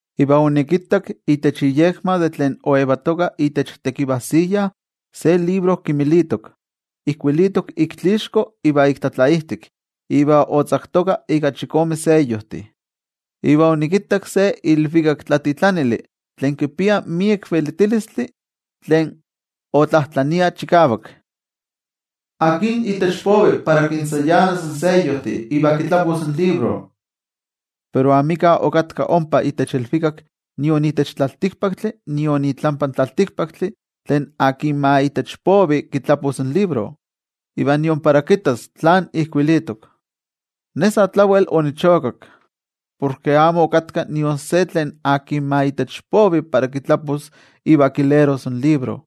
Iva onikittak itech iyekma de tlen oyetoka itech tekivajsiya se libro kimilitok, ijkuilitok ik tlatlaixko iva ik tlatlaijtik iva otzaktoka ika chikome seyojtih. Iva onikittak se ilvikaktlatitlanili tlen kipia miek velitilistli tlen otlajtlania chikavak: —¿Akin itech povi para kintzayanas in seyojtih iva kitlapos in libro? Pero amika okatka ompa itech ilvikak nion itech tlaltikpaktli nion itlampa in tlaltikpaktli tlen akin ma itech povi kitlapos in libro, iva nion para kittas tlán ijkuilitok. Ne sa tlawel onichokak, porke amo okatka nion se tlen akin ma itech povi para kitlapos iva kileros in libro,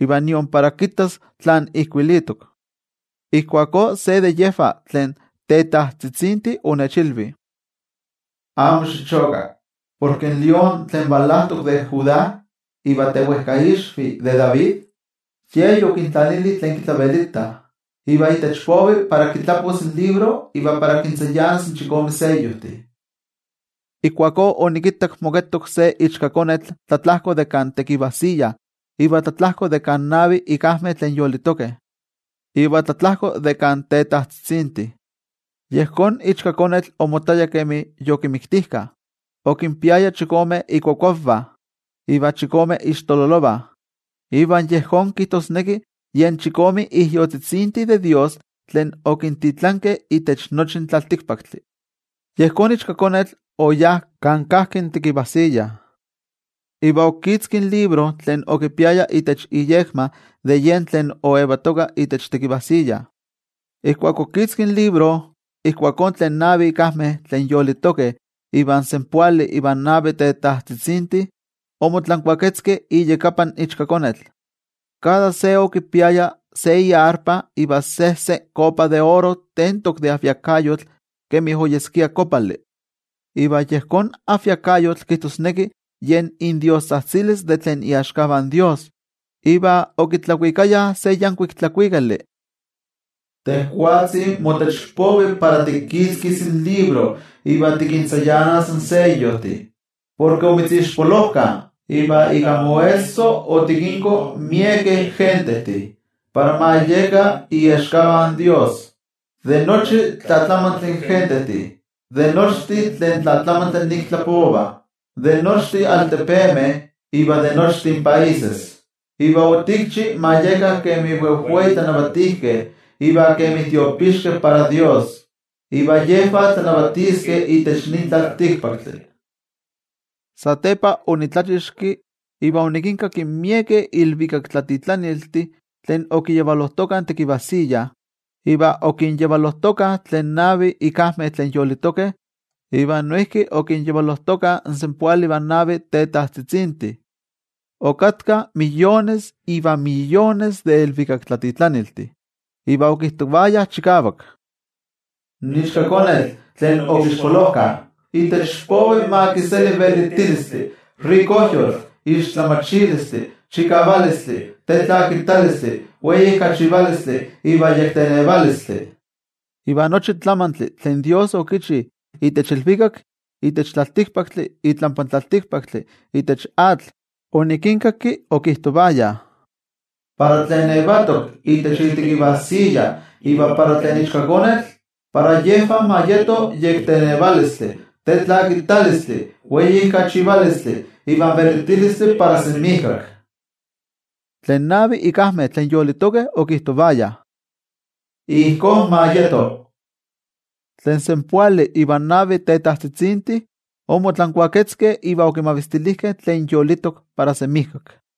iva nion para kittas tlán ijkuilitok. Ijkuakó se de yejvah tlen tetajtzitzintih onechilvi: —Amo xichoka, porke in lión tlen valajtok de Judá iva tewejkaixvi de David, Ye yokintlanili tlen kitlavelitah iva itech povi para kitlapos in libro iva kintzayanas in chikome seyojtih. Ijkuakó onikittak moketok se Ichkakonetl tlatlajko de kan tekivajsiya iva tlatlajko de kan navi ikajmeh tlen yolitokeh, iva tlatlajko de kan tetajtzitzintih. Yejón Ichkakonetl omottaya kemi yokimiktijkah. Okinpiaya chikome ikuakuavah iva chikome ixtololovah, iva yejón kijtosneki yen chikome ijyotzitzintih de toYejwatzi tlen okintitlankeh itech nochi in tlaltikpaktli. Yejón Ichkakonetl oyá kan kajki in tekivajsiya, iva okitzki in libro tlen okipiaya itech iyekma de yen tlen oyetoka itech tekivajsiya. Ijkuak okitzki in libro, ijkuakó tlen navi ikajmeh tlen yolitokeh iva in senpoali ivan navi tetajtzitzintih, omotlankuaketzkeh iyakapan Ichkakonetl. Kada se okipiaya se arpa iva sejse kopa de oro tentok de ajviakayotl kemi oyeskia kopali, iva yejón ajviakayotl kijtosneki yen indiostzajtzilis de tlen iaxkavah in toYejwatzi. Iva okitlakuikayah se yankuik tlakuikali: Tejwatzi motech povi para tikitzkis in libro iva tikintzayanas in seyojtih. Porke omitzixpolojkah, iva ika moesso otikinko miekeh gentejtih para ma yekah iaxkavah in Dios, de nochi tlatlamantli gentejtih, de nochtin tlen tlatlamantli nik tlapovah, de nochtin altepemeh, iva de nochtin países. Iva otikchi ma yekah kemi wejwei tlanavatijkeh iva kemi tiopixkeh para Dios, iva yejvah tlanavatiskeh itech nin tlaltikpaktli. Satepa onitlachixki iva onikinkakki miekeh ilvikaktlatitlaniltih tlen okiyavalojtokah in tekivajsiya, iva okinyavalojtokah tlen navi ikajmeh tlen yolitokeh, iva noijki okinyavalojtokah in senpoali ivan navi tetajtzitzintih. Okatkah miyones iva miyones de ilvikaktlatitlaniltih. Iva okijtovayah chikavak: In Ichkakonetl tlen okixpolojkah itech povi ma kiseli velitilistli, rikojyotl, tlamatilistli, chikavalistli, tetlakitalistli, weijkachivalistli iva yektenevalistli. Iva nochi tlamantli tlen toYejwatzi okichi itech ilvikak, itech tlaltikpaktli, itlampa tlaltikpaktli, itech atl, onikinkaki okijtovayah: Para tlen yetok itech itekivajsiya iva para tlen Ichkakonetl, para yejvah ma yeto in yektenevalistli, tetlakitalistli, weijkachivalistli iva in velitilistli para semijkak. Tlen navi ikajmeh tlen yolitokeh okijtovayah: —¡Ijkó ma yeto! Tlen senpoali ivan navi tetajtzitzintih omotlankuaketzkeh iva okimavistilijkeh tlen yolitok para semijkak.